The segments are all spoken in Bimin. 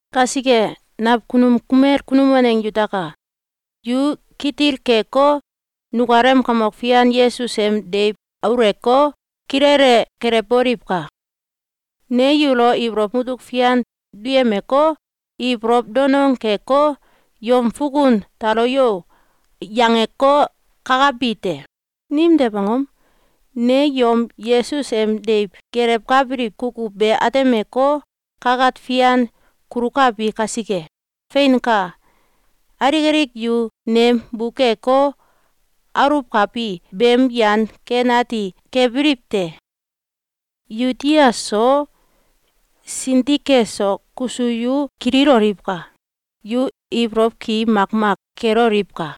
Kasike, nakunum kumel kunum waneng yutaka! Yu kitil keko, nukalem Kamok Fian Yesus em deiw auleko, kilele gelewboliwka! Ne yulo ibolow mutuk fian duyemeko, ibolow danong keko, “Yom fukun tolo yo!”, yangeko, kakabi te. Nimtew angom? Ne yom Yesus em deiw gelewkabiliw kukuw be atemeko, kakat fian kulukabi kasike. Feinka! Alik alik yu nem bukeko, aluwkabi beem yan ken ati kebiliw te. Yuodia so, Sintike so, kuso yu kililoliwka! Yu ibolow ki makmak keloliwka!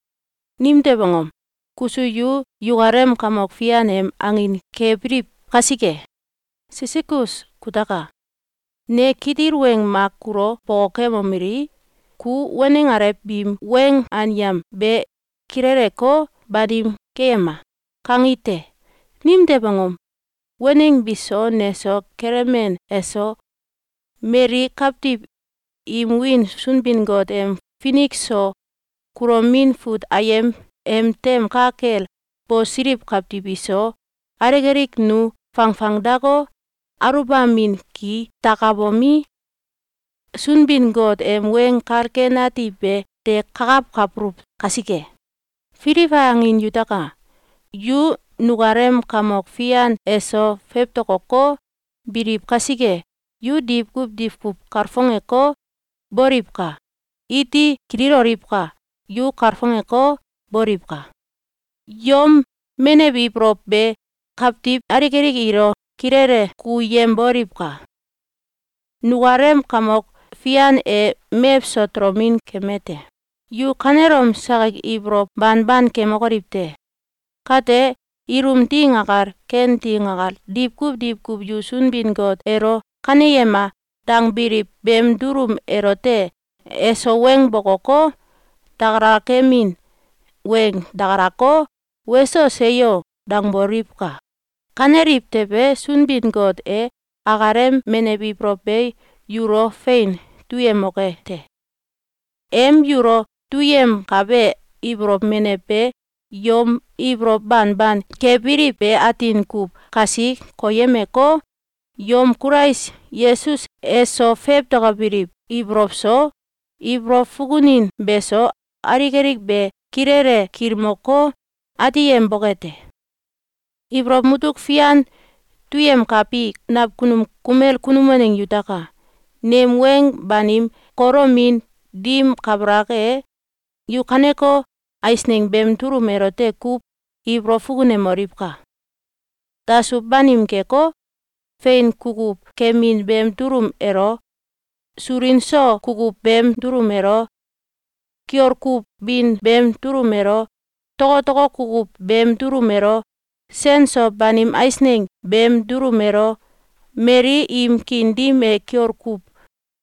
Nimtew angom? Kuso yu yukalem Kamok Fian em angin kebiliw kasike. Sisigos kutaka! Ne kitil weng mak kulo bokokemomeli: “Ku waneng alew biim weng anyam be kileleko, banim keyema!”, kangi te. Nimtew angom? Waneng biso, neso, Kelemen eso, mali kawtiw im wiin Sunbin-Got em Finik so Kulomin Fut Ayem em tem ka kel bosiliw kawtiw iso, alik alik nu fangfangdako, aluwbamin ki dakabomi, Sunbin-Got em Weng Kal Ken Ati be de kakawkabuluw kasike. Filibai angin yutaka! Yu nukalem Kamok Fian eso fewtokoko, biliw kasike, yu diwkuw diwkuw kalfongeko, boliwka! Iti kililoliwka! Yu kalfongeko, boliwka! Yom menew ibolow be kawtiw alik alik ilo kilele kukuyemboliwka! Nukalem Kamok Fian e mewso tolomin keme te. Yu kanelom sakik ibolow banban kemokoliw te! Kate, ilum ding akal, ken ding akal, diwkuw diwkuw yu Sunbin-Got elo “Kaneyema!”, dangbiliw beem dulum elote eso weng bokoko, dakalakamin weng dakalako, “Weso! Seyo!”, dangboliwka! Kaneliw tewe, Sunbin-Got e akalem menew ibolow be yulo fein duyemoke te. Em yulo duyemkabe ibolow menew be yom ibolow banban kebiliw be atin kuw kasi koyemeko, yom Kulais Yesus eso fewtokobiliw ibolow so, ibolow fukunin beso, alik alik be kilele kilmoko, ateyemboke te. Ibolow mutuk fian duyemkabi nakunum kumel kunum waneng yutaka! Nem weng banim kolomin dim kabalak e, yu kaneko eisneng beem dulum elote kuw ibolow fukunemoliwka! Dasuw banim keko, fein kukuw kemin beem dulum elo, sulin so kukuw beem dulum elo, kiol kuw bin beem dulum elo, tokotoko kukuw beem dulum elo, sen so banim eisneng beem dulum elo, mali im kiin dim e kiol kuw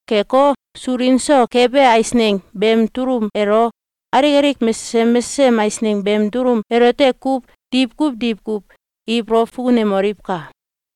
keko, sulin so kebe eisneng beem dulum elo, alik alik mesesem mesesem eisneng beem dulum elote kuw diwkuw diwkuw ibolow fukunemoliwka!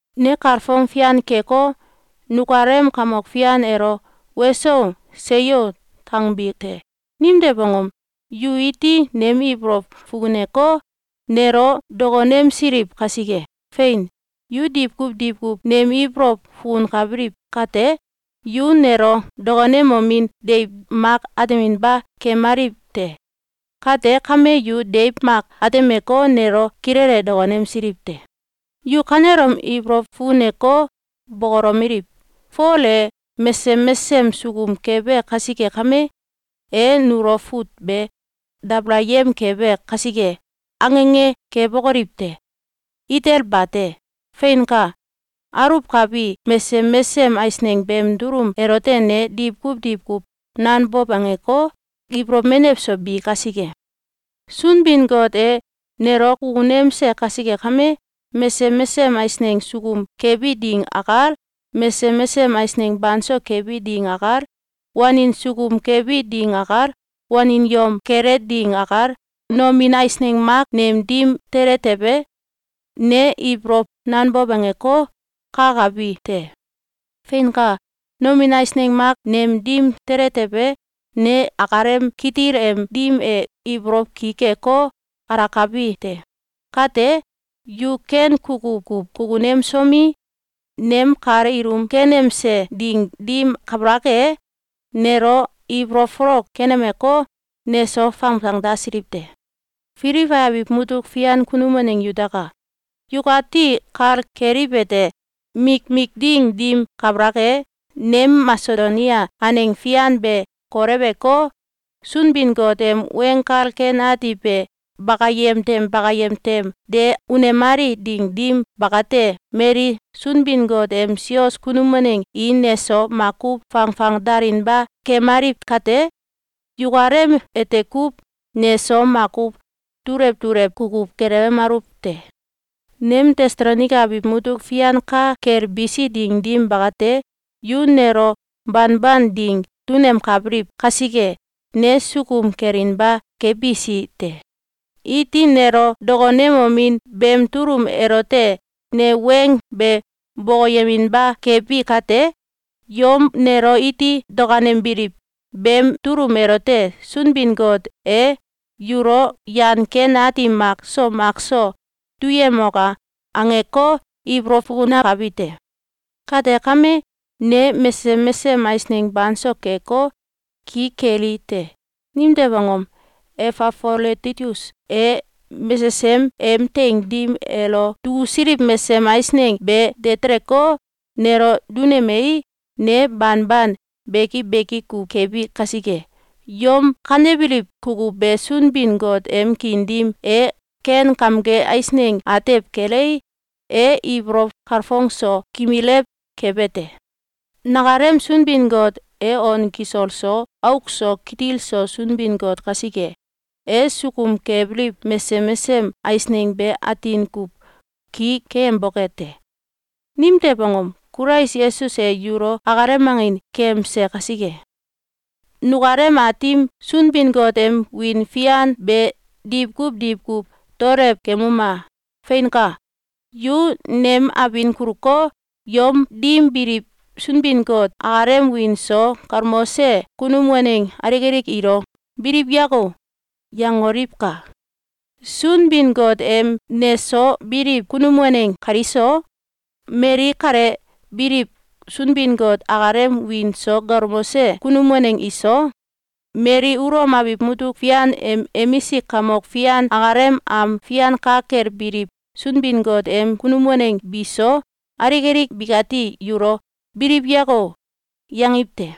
Ne kalfong fian keko, nukalem Kamok Fian elo “Weso! Seyo!”, dangbi te. Nimtew angom? Yu iti nem ibolow fukuneko, nelo dokonemsiliw kasike. Fein! Yu diwkuw diwkuw nem ibolow fukunkabiliw kate, yu nelo dokonemomin deiw mak ateminba kemaliw te. Kate kame, yu deiw mak atemeko, nelo kilele dokonemsiliw te. Yu kanelom ibolow fukuneko, bokolomeliw: “Fol e mesesem mesesem sukum kebe kasike kame, e nulo fut be dabalayem kebe kasike!”, ange ange kebokoliw te! Itel bate! Feinka! Aluwkabi mesesem mesesem eisneng beem dulum elote ne diwkuw diwkuw nanbow angeko, ibolow menew so bi kasike. Sunbin-Got e nelo kukunemse kasike kame, mesesem mesesem eisneng sukum kebi ding akal, mesesem mesesem eisneng banso kebi ding akal, wanin sukum kebi ding akal, wanin yom kele ding akal, nomin eisneng mak nem dim tele tewe, ne ibolow nanbow angeko, kakabi te. Feinka! Nomin eisneng mak nem dim tele tewe, ne akalem kitil em dim e ibolow ki keko, alakabi te. Kate, yu ken kukuw kuw kukunemsomi, nem kal ilum kenemse ding dim kabalak e, nelo ibolow folok kenemeko, neso fangfangdasiliw te. Filibai abiw mutuk fian kunum waneng yutaka! Yukati kal keliwete: Mikmik ding dim kabalak e, nem Masedonia aneng fian be koleweko, Sunbin-Got em Weng Kal Ken Ati be bakayem tem bakayem tem de unemali ding dim bakate, mali Sunbin-Got em sios kunum waneng i neso makuw fangfangdalinba kemaliw kate, yukalem ete kuw neso makuw dulew dulew kukuw gelewemaluw te. Nem Tesalonaika abiw mutuk fian ka kel bisi ding dim bakate, yu nelo banban ding dunemkabiliw kasike, ne sukum kelinba kebisi te. Iti nelo dokonemomin beem dulum elote ne weng be bokoyeminba kebi kate, yom nelo iti dakanembiliw beem dulum elote “Sunbin-Got e yulo yan ken ati mak so mak so duyemoka!”, angeko, ibolow fukunakabi te. Kate kame, ne mesesem mesesem eisneng banso keko, ki keli te. Nimtew angom? Efafoloditus e mesesem em teing dim elo dukusiliw mesesem eisneng be de teleko, nelo dunemei, ne banban beki beki kuw kebi kasike. Yom kanebiliw kukuw be Sunbin-Got em kiin dim e ken kamge eisneng atew kelei, e ibolow kalfong so kimilew kebe te. Nakalem Sunbin-Got e on kisol so auk so kitil so Sunbin-Got kasike, e sukum kebiliw mesesem mesesem eisneng be atin kuw ki keyemboke te. Nimtew angom? Kulais Yesus e yulo akalem angin keyemse kasike. Nukalem Aatim Sunbin-Got em wiin fian be diwkuw diwkuw daolew kemuma! Feinka! Yu nem abin kuluko, yom dim biliw Sunbin-Got akalem wiin so galmose kunum waneng alik alik ilo “Biliw yako!”, yangoliwka! Sunbin-Got em neso biliw kunum waneng kaliso, mali kale biliw Sunbin-Got akalem wiin so galmose kunum waneng iso, mali Ulom abiw mutuk fian em emisik kamok fian akalem am fian ka kel biliw Sunbin-Got em kunum waneng bi so, alik alik bikati yulo “Biliw yako!”, yangiw te.